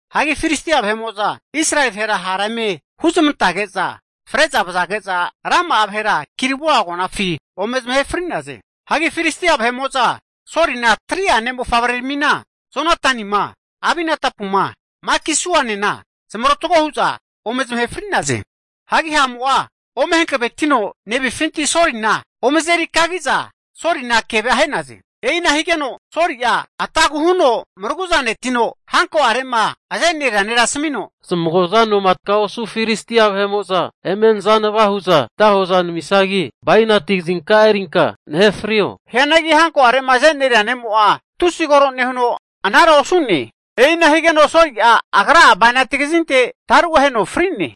Hagi Filistia vahe'mo'za Israeli vahera ha' eme huzamantage'za fre'za vazage'za rama'a vahera Gilboa agonafi ome zamahe fri'naze. Hagi Filistia vahe'mo'za Solina 3'a ne' mofavre'aramina, Jonatanima, Abinadapuma, Malki-suanena zamarotgo hu'za ome zamahe fri'naze. Hagi ha'mo'a ome hankavetino nevinfinti Solina ome azeri kagige'za Soli'na kevea ahe'naze. E'ina higeno Soli'a atagu huno maraguzanetino hanko'are'ma azeneria nera asamino, zamago'za noma taga osu Filistia vahe'mo'za eme nazanava hu'za nata hoza namisagi, bainati kazinka'a erinka nahe frio. Hianagi hanko'are'ma azeneria ne'mo'a tusi kore nehuno anara osu'ne. E'ina higeno Soli'a agra'a bainati kazinte taru aheno fri'ne.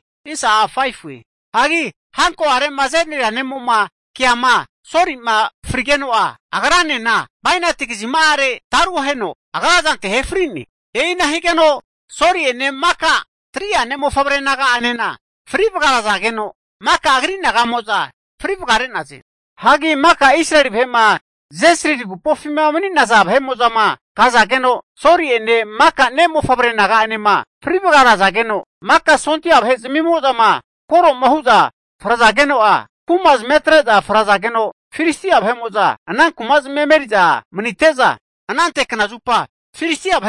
Hagi hanko'are'ma azeneria ne'mo'ma keama Soli'ma frigeno'a, agra'enena bainati kazima'are taru aheno agra zante ahe fri'ne. E'ina higeno, Soli'ene maka 3'a ne'mofavre naga'enena fri vagarazageno, maka agri naga'mo'za fri vagare'naze. Hagi maka Israeli vahe'ma Jezrili agupofima mani'naza vahe'mo'zama kazageno, Soli'ene maka ne'mofavre naga'anema fri vagarazageno, maka sondia vahe'zmimo'zama koroma hu'za frazage'za Filistia vahe'mo'za ana kumazmia emeri'za manite'za, anante kna zupa Filistia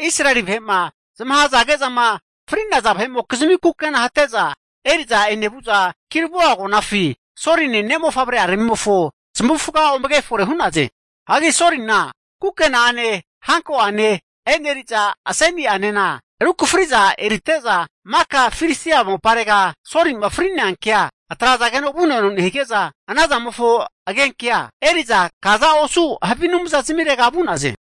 Israeli vahe'ma zamahazage'zama fri'naza vahe'mokizimi kukena hate'za eri'za enevu'za, Gilboa agonafi Soline ne'mofavre'aramimofo zamavufaga ome kefore hu'naze. Hagi Solina kukena'ane hanko'ane, e'neriza aseni'anena rukafri'za erite'za, maka Filistia moparega Soli'ma fri'nea kea atrazageno vuno eno nehige'za, anazamofo agenkea eri'za kaza osu havi anumzazmirega vu'naze.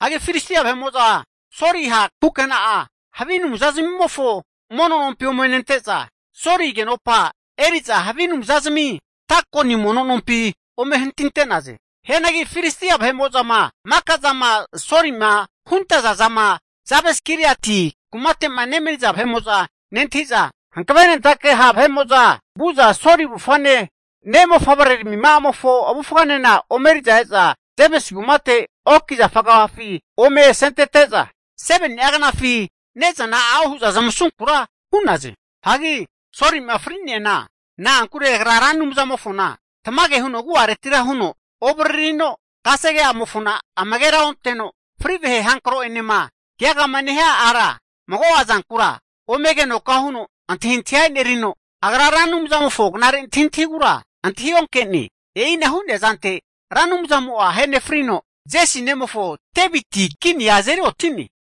Hagi Filistia vahe'mo'za Soli ha' kukena'a havi anumzazmimofo mono nompi ome nente'za, Soli agenopa eri'za havi anumzazmi Dagoni mono nompi ome hantinte'naze. Hianagi Filistia vahe'mo'zama maka zama Solima huntazazana Jabes-giliati kumate'ma nemani'za vahe'mo'za nentahi'za, hankavenentake ha' vahe'mo'za vu'za Soli avufane, ne' mofavreramima'amofo avufganena ome eri'za Jabes kumate oki zafa agafafi ome asezamantete'za, 7ni'a knafi ne'zana a'o hu'za zamasunkura hu'naze. Hagi Soli'ma fri'neana, na'ankure agra Ra Anumzamofona tamage huno agu'aretira huno ovaririno, kasege'amofona amagera onte'no, fri vahe hankro'enema keagama nehia ara mago'a zankura ome agenoka huno antahintahia e'nerino, agra Ra Anumzamofo knare antahintahigura antahionke'ne. E'ina hu'nea zante Ra Anumzamo'a ahenefrino, Jesi nemofo Deviti kinia azeri oti'ne.